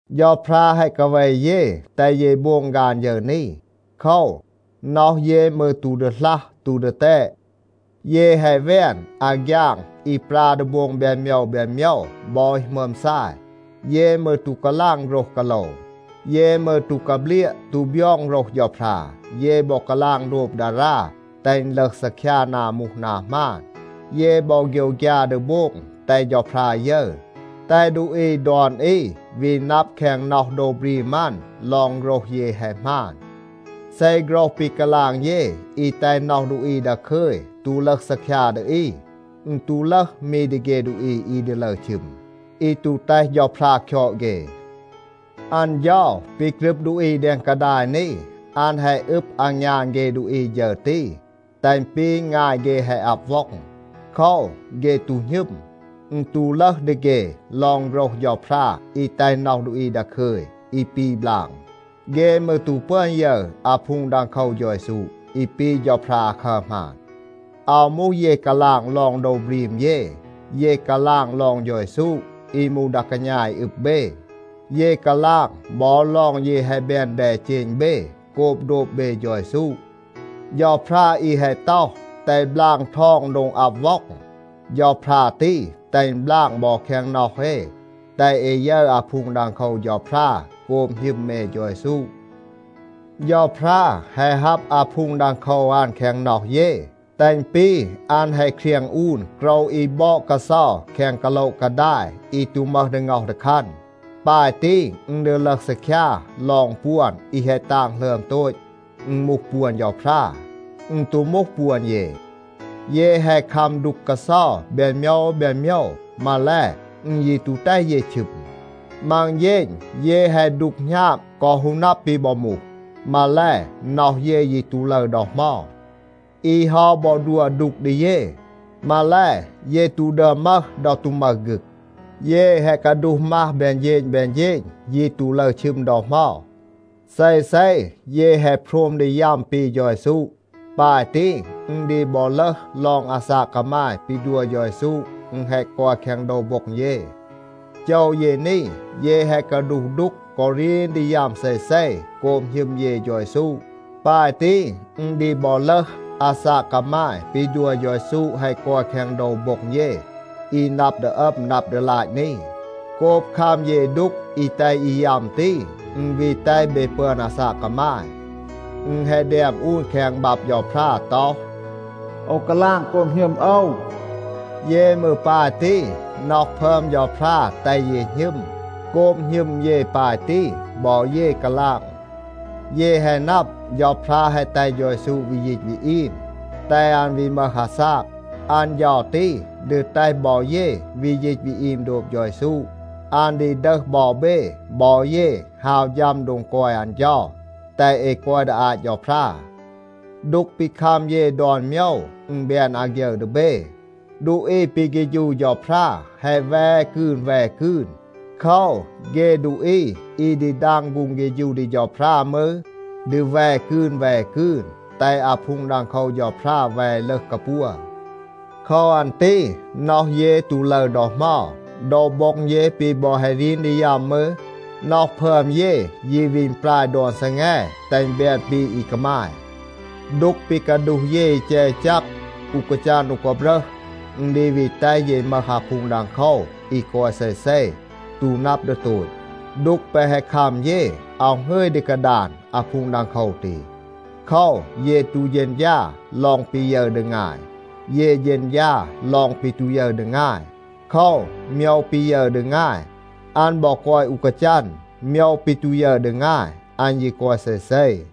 เฌาพรา แฮะ กาเว เย, แตห เย โบง ฆาน ฌึร นี. โคว, น็อห เย มืร ตู ดีหลัห, ตู ดีแตด. เย แฮะ แวน อาฆยาง อี ปรา ดี โบง แบน โมยว แบน โมยว บอ อี หมึอม ซาย. เย มืร ตู กาลาง โฆรห กาโลว. เย มืร ตู กาเบลียะ ตู บยอง โฆรห เฌาพรา. เย บอ กาลาง โดบ ดารา แตห อึณ ลึห ซีคยา นา มูห นา หมาน. เย บอ โฆยวฆยา ดี โบง แตห เฌาพรา ยึร, แตห ดูอี ดอน อี วี นับ แคง น็อห โดว บรีม อัน ลอง โฆรห เย แฮะ หมาน. เซ โฆรห ปี กาลาง เย อี แตห น็อห ดูอี ดาคึย ตู ลึห ซีคยา ดี อี, อึณ ตู ลึห มี ดี เฆ ดูอี อี ดี ลึร ชึม, อี ตู แตห เฌาพรา คยอด เฆ. อัน เฌา ปี กรึบ ดูอี แดง กาดาย นี, อัน แฮะ อึบ อางยาน เฆ ดูอี ฌึร ตี, แตห อึณ ปี งาย เฆ แฮะ อับ ว็อง. โคว, เฆ ตู หณึม. อึณ ตู ลึห ดี เฆ ลอง โฆรห เฌาพรา อี แตห น็อห ดูอี ดาคึย, อี ปี บลาง. เฆ มืร ตู ปึอน ยึร อาพูง ดังโคว เฌา เยซู, อี ปี เฌาพรา อาคัร หมาน. อาว มูห เย กาลาง ลอง โดว บรีม เย. เย กาลาง ลอง เฌา เยซู อี มูห ดา กาณา อี อึบ เบ. เย กาลาง บอ ลอง เย แฮะ แบน แดเจณ เบ โกบ โดบ เบ เฌา เยซู. เฌาพรา อี แฮะ ต็อห, “แตห บลาง ทอง โดง อับ ว็อง,” เฌาพรา ตี แตห อึณ บลาง บอ แคง น็อห เอ, แตห เอ ยึร อาพูง ดังโคว เฌาพรา โกบ หณึม เอ เฌา เยซู. เฌาพรา แฮะ ฮับ อาพูง ดังโคว อัน แคง น็อห เย, แตห อึณ ปี อัน แฮะ เครียง อูน โกรว อี บอด กาเซา แคง กาโละ กาดาย อี ตู มึห ดี ง็อห ดี คัน. ปาย ตี, อึณ ดี ลึห ซีคยา ลอง ปวน อี แฮะ ตาง หลึอม โตต, อึณ มูห ปวน เฌาพรา. อึณ ตู มูห ปวน เย. เย แฮะ คัม ดูก กาเซา แบน โมยว แบน โมยว. มาแล, อึณ ยี ตู แตห เย ชึม. มัง เฌณ เย แฮะ ดูก หณาบ กอ ฮู นับ ปี บอ มูห. มาแล, น็อห เย ยี ตู ลึร ดอ เหมา. อี เฮา บอ ดัว ดูก ดี เย, มาแล, เย ตู ดึอม มึห ดอ ตู มึห ฆึก. เย แฮะ กาดูห มัห แบน เฌณ แบน เฌณ. ยี ตู ลึร ชึม ดอ เหมา. เซเซ เย แฮะ โพรม ดี ยัม ปี เฌา เยซู. ปาย ตี, อึณ ดี บอ ลึห ลอง อาซาก กามาย ปี ดัว เฌา เยซู, อึณ แฮะ กอย แคง โดว โบ็ง เย. โจว เย นี, เย แฮะ กาดูห ดูก กอ รีน ดี ยัม เซเซ โกบ หณึม เย เฌา เยซู. ปาย ตี, อึณ ดี บอ ลึห, อาซาก กามาย ปี ดัว เฌา เยซู แฮะ กอย แคง โดว โบ็ง เย อี นับ ดี อัม, นับ ดี ลาต นี. โกบ คัม เย ดูก อี แตห อี ยัม ตี, อึณ วี แตห เบ ปึอน อาซาก กามาย. อึณ แฮะ แดม อูน แคง บับ เฌาพรา ต็อห, “โอว กาลาง โกบ หณึม โอว.” เย มืร ปาย ตี, น็อห พึอม เฌาพรา แตห เย หณึม. โกบ หณึม เย ปาย ตี, บอ เย กาลาง. เย แฮะ นับ, เฌาพรา แฮะ แตห เฌา เยซู วี ยีต วี อีม, แตห อัน วี มึห อาซาก. อัน เฌา ตี ดี แตห บอ เย วี ยีต วี อีม โดบ เฌา เยซู. อัน ดี ดึห บอ เบ บอ เย ฮาว ฌัม โดง กอย อัน เฌา, แตห เอ กอย ดี อาต เฌาพรา. ดูก ปี คัม เย ดอน โมยว, อึณ แบน อาฆยึร ดี เบ. ดูอี ปี เฆฌู เฌาพรา แฮะ แว กืน แว กืน. โคว, เฆ ดูอี อี ดี ดาง ฆูง เฆฌู ดี เฌาพรา มืร, ดี แว กืน แว กืน, แตห อาพูง ดังโคว เฌาพรา แว ลึห กาปัว. โคว อัน ตี น็อห เย ตู ลึร ดอ เหมา. โดว โบ็ง เย ปี บอ แฮะ รีน ดี ยัม มืร, น็อห พึอม เย ยี วี อึณปราย ดอน ซีแง, แตห อึณ แบน ปี อี กามาย. ดูก ปี กาดูห เย อี แจก อี แจก, อู กาจัน อู กาบรึห, อึณ ดี วี แตห เย มึห อาพูง ดังโคว อี กอย เซเซ, ตู นับ ดี โตต. ดูก แปะ แฮะ คัม เย, อาว หงึย ดี กาดาน อาพูง ดังโคว ตี. โคว, เย ตู เฌณฌา ลอง ปี ยึร ดี งาย. เย เฌณฌา ลอง ปี ตู ยึร ดี งาย. โคว, โมยว ปี ยึร ดี งาย, อัน บอ กอย อู กาจัน. โมยว ปี ตู ยึร ดี งาย, อัน ยี กอย เซเซ.